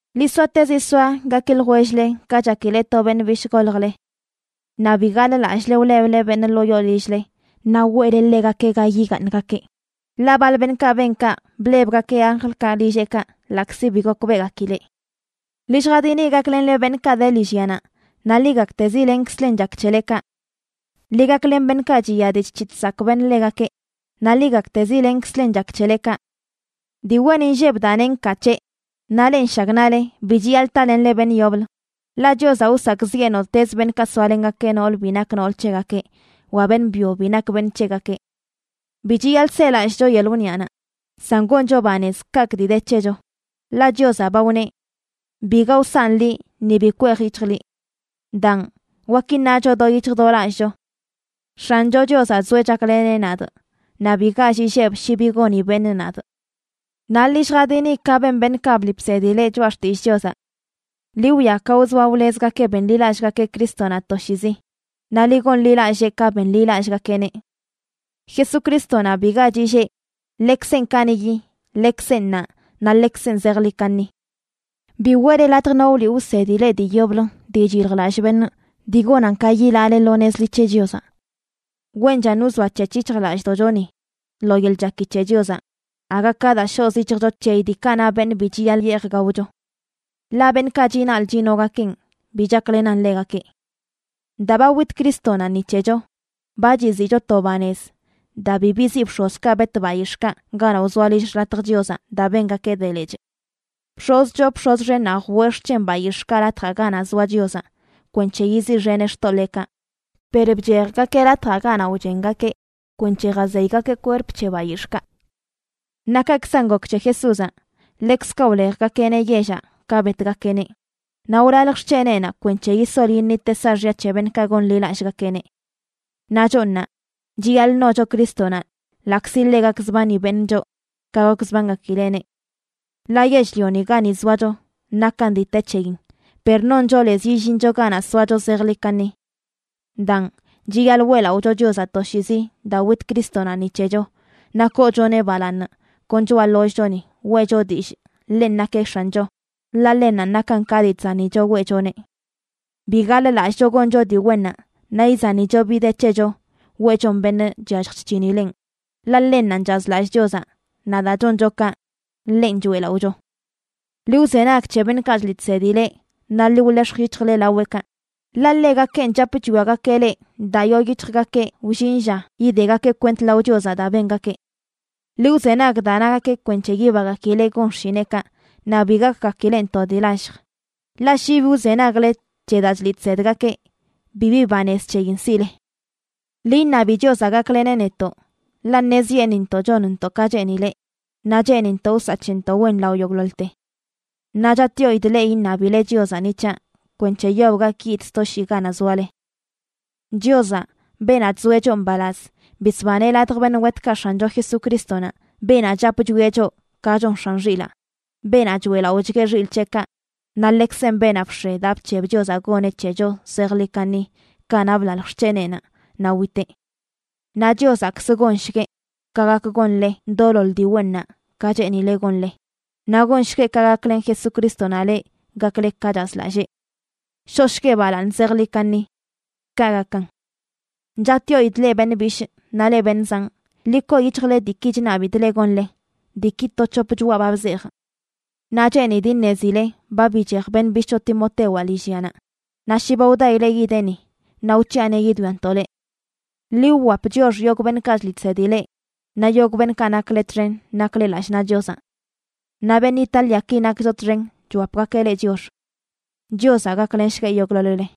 Ḻi soatezi soa gaki ljwell-le ka chakile to beṉꞌ bishꞌ goljle. Naꞌ bi gaḻꞌlallꞌle wleble beṉꞌ ḻoo yoo lill-le naꞌ weꞌle ḻegakeꞌ ga yigaaṉgakeꞌ, ḻaꞌ baḻ beṉꞌkaꞌ ben kaꞌ blebgakeꞌ anjlkaꞌ lilleꞌkaꞌ, ḻaꞌkzi bi gokbeꞌgakileꞌ. Ḻi lljadini gaklenle beṉꞌkaꞌ de lillyanaꞌ, naꞌ ḻi gaktezi lenkzlen chak c̱hele kaꞌ. Ḻi gaklen beṉꞌkaꞌ chiya dii chc̱hiꞌ chsakꞌ beṉꞌ ḻegakeꞌ, naꞌ ḻi gaktezi lenkzlen chak c̱hele kaꞌ. Dii wen inlleb daa neꞌ nkaa c̱heꞌ, naꞌ leꞌ nshagnaꞌle bi chiyaḻꞌ talenle beṉꞌ yoblə, ḻaꞌ Chiozaꞌ wsakꞌziꞌe nottez beṉꞌkaꞌ soalengakeꞌ nool bi nak nool c̱hegakeꞌ wa beṉꞌ byo bi nak beṉꞌ c̱hegakeꞌ. Bi chiyaḻꞌ selallꞌcho yeḻꞌ wniꞌanaꞌ, san goncho banez kaꞌkꞌ dii de c̱hecho, ḻaꞌ Chiozaꞌ ba wneꞌ: “Biga wsanꞌ liꞌ ni bi kwej yic̱hjꞌ liꞌ.” Daan, wak iṉacho do yic̱hj do lallꞌcho: X̱ancho Chiozaꞌ zoeꞌ chakleneꞌ nadꞌ. Naꞌ bi gall illebꞌ shi bi goni beṉꞌ nadꞌ. Naꞌ ḻi lljadini ka ben beṉꞌkaꞌ bliꞌ bsedi leꞌ choꞌa xtillꞌ Chiozaꞌ. Ḻi wwia ka wzoa wlezgakeꞌ benḻilallꞌgakeꞌ Crístonaꞌ toshiizi, naꞌ ḻi gonḻilallee ka benḻilallꞌgakeꞌneꞌ. Jesucrístonaꞌ biga chillee, ḻekzenꞌ kaniꞌyi, ḻekzenꞌ ṉaa naꞌ ḻekzenꞌ zejḻi kaṉi. Bi weꞌle latj no wliꞌ wsedi leꞌ dii yoblə dii chyiljlallꞌ beṉꞌ dii gonan ka yilaale lo nez ḻi c̱he Chiozaꞌ. Wenchan wzoac̱hec̱h yic̱hjlallꞌdoꞌchoni lo yeḻꞌ chaki c̱he Chiozaꞌ, aga ka daa shoꞌz yic̱hjcho c̱heyi diikaꞌ na beṉꞌ bi chiyaḻꞌ yeej gaocho. Ḻaꞌ beṉꞌkaꞌ chinaḻꞌ chinogakeꞌn bi chaklenan ḻegakeꞌ. Daa ba wit Crístonaꞌ ni c̱hecho, ba chiziꞌcho to banez daa bi biziꞌ bx̱ozkaꞌ bet bayix̱ꞌkaꞌ ganaꞌ wzoa lill xḻatj Chiozaꞌ daa bengakeꞌ de lechꞌ. Bx̱oz choo bx̱oz xennaꞌ jwee xc̱hen bayix̱ꞌkaꞌ Latjaꞌ Ganaꞌ Zoa Chiozaꞌ kwenc̱he yiziꞌxeneꞌ xtoḻeekaꞌ, per bchejgakeꞌ latjaꞌ ganaꞌ wchengakeꞌ kwenc̱he jazeygakeꞌ kwerp c̱he bayix̱ꞌkaꞌ. Naꞌ kaꞌkzan gok c̱he Jesúzaꞌ, ḻekzkaꞌ wlejgakeꞌneꞌ yellaꞌ ka betgakeꞌneꞌ. Naꞌ wlalj xc̱heneꞌnaꞌ kwenc̱he yisol yiṉiteꞌ saaxya c̱he beṉꞌkaꞌ gonḻilallꞌgakeꞌneꞌ. Naꞌ choꞌ ṉaa, chiyaḻꞌ ṉocho Crístonaꞌ ḻaꞌkzi ḻe gakzbani beṉꞌ choꞌ ka gokzbangakileꞌneꞌ. Ḻaꞌ yell-lioni gani zoacho nakan dii te c̱heyin, per noncho lez yillincho ganaꞌ soacho zejḻi kaṉi. Daan, chiyaḻꞌ weꞌlaꞌocho Chiozaꞌ toshiizi daa wit Crístonaꞌ ni c̱hecho, naꞌ koochoneꞌ balaaṉ kon choꞌa ḻollꞌchoni weꞌcho dillꞌ ḻenꞌ nakeꞌ X̱ancho, ḻaꞌ ḻennanꞌ nakan ka dii chzanicho weꞌchoneꞌ. Bi gaḻ-lallꞌcho goncho dii wennaꞌ naꞌ izanicho bi de c̱hecho weꞌchon beṉꞌ chyallj chc̱hinileꞌn, ḻaꞌ ḻennanꞌ chazlallꞌ Chiozaꞌ naꞌ daa choncho kaꞌ, ḻenꞌ choeꞌlaꞌocho. Ḻi wzenag c̱he beṉꞌkaꞌ chliꞌ chsedi leꞌ naꞌ ḻi wḻex̱j yic̱hjle laweꞌkaꞌ, ḻaꞌ ḻegakenꞌ chap chwiagakeꞌ leꞌ daa yoo yic̱hjgakeꞌ wllin lla yidegakeꞌ kwent lao Chiozaꞌ daa bengakeꞌ. Ḻi wzenag daa nagakeꞌ kwenc̱he yibagakileꞌ gon xshineꞌkaꞌ naꞌ bi gakgakileꞌn to dii lallj. Ḻaꞌ shi bi wzenagle c̱he daa chliꞌ chsedgakeꞌ, bibi banez c̱heyin siꞌle. Ḻi iṉabi Chiozaꞌ gakleneꞌ netoꞌ, ḻaꞌ ṉezyeṉꞌintoꞌ chonntoꞌ ka cheenileꞌ, naꞌ cheenintoꞌ wsaꞌ c̱hentoꞌ wen lao yogꞌḻoḻte. Naꞌ chatꞌyoidꞌ leꞌ iṉabile Chiozaꞌ ni c̱haꞌ kwenc̱he yob gak yidꞌ sto shii ganaꞌ zoale. Chiozaꞌ, beenaꞌ chzoeꞌ choꞌ mbalaz, bisbaneꞌ ladj beṉꞌ wetkaꞌ X̱ancho Jesucrístonaꞌ, beenaꞌ chap chwia choꞌ ka chon x̱an xilaa, beenaꞌ choeꞌlaꞌochga xilꞌ c̱heꞌkaꞌ. Naꞌ ḻekzenꞌ beenaꞌ bx̱e daa bc̱heb Chiozaꞌ goneꞌ c̱hecho zejḻi kaṉi kanaꞌ blalj xc̱heneꞌnaꞌ naꞌ witeꞌ. Naꞌ Chiozaꞌkzə gonshgueꞌ ka gak gonle doloḻ dii wennaꞌ ka cheenileꞌ gonle, naꞌ gonshgueꞌ ka gaklen Jesucrístonaꞌ leꞌ gakle ka chazlallee. ¡Shoꞌshgueꞌ balaaṉ zejḻi kaṉi! Kaꞌ gakan. Chatꞌyoidꞌ leꞌ beṉꞌ bishꞌ naꞌ leꞌ beṉꞌ zanꞌ, ḻi koo yic̱hjle diiki chṉabidꞌ leꞌ gonle, diiki to c̱hop choꞌa ba bzejꞌ. Naꞌ cheenidꞌ iṉezile ba bichej beṉꞌ bishꞌcho Timotewaꞌ lillyanaꞌ, naꞌ shi ba wdaileꞌ yideꞌ ni, naꞌ wc̱hiꞌaneꞌ yidwiantoꞌ leꞌ. Ḻi wwap chiox yogꞌ beṉꞌkaꞌ chliꞌ chsedi leꞌ naꞌ yogꞌ beṉꞌkaꞌ nakle txen nakle lallꞌ naꞌ Chiozaꞌ. Naꞌ beṉꞌ Itáliaki nakcho txen chwapgakeꞌ leꞌ chiox. Chiozaꞌ gaklenshgueꞌ yogꞌḻoḻ-le.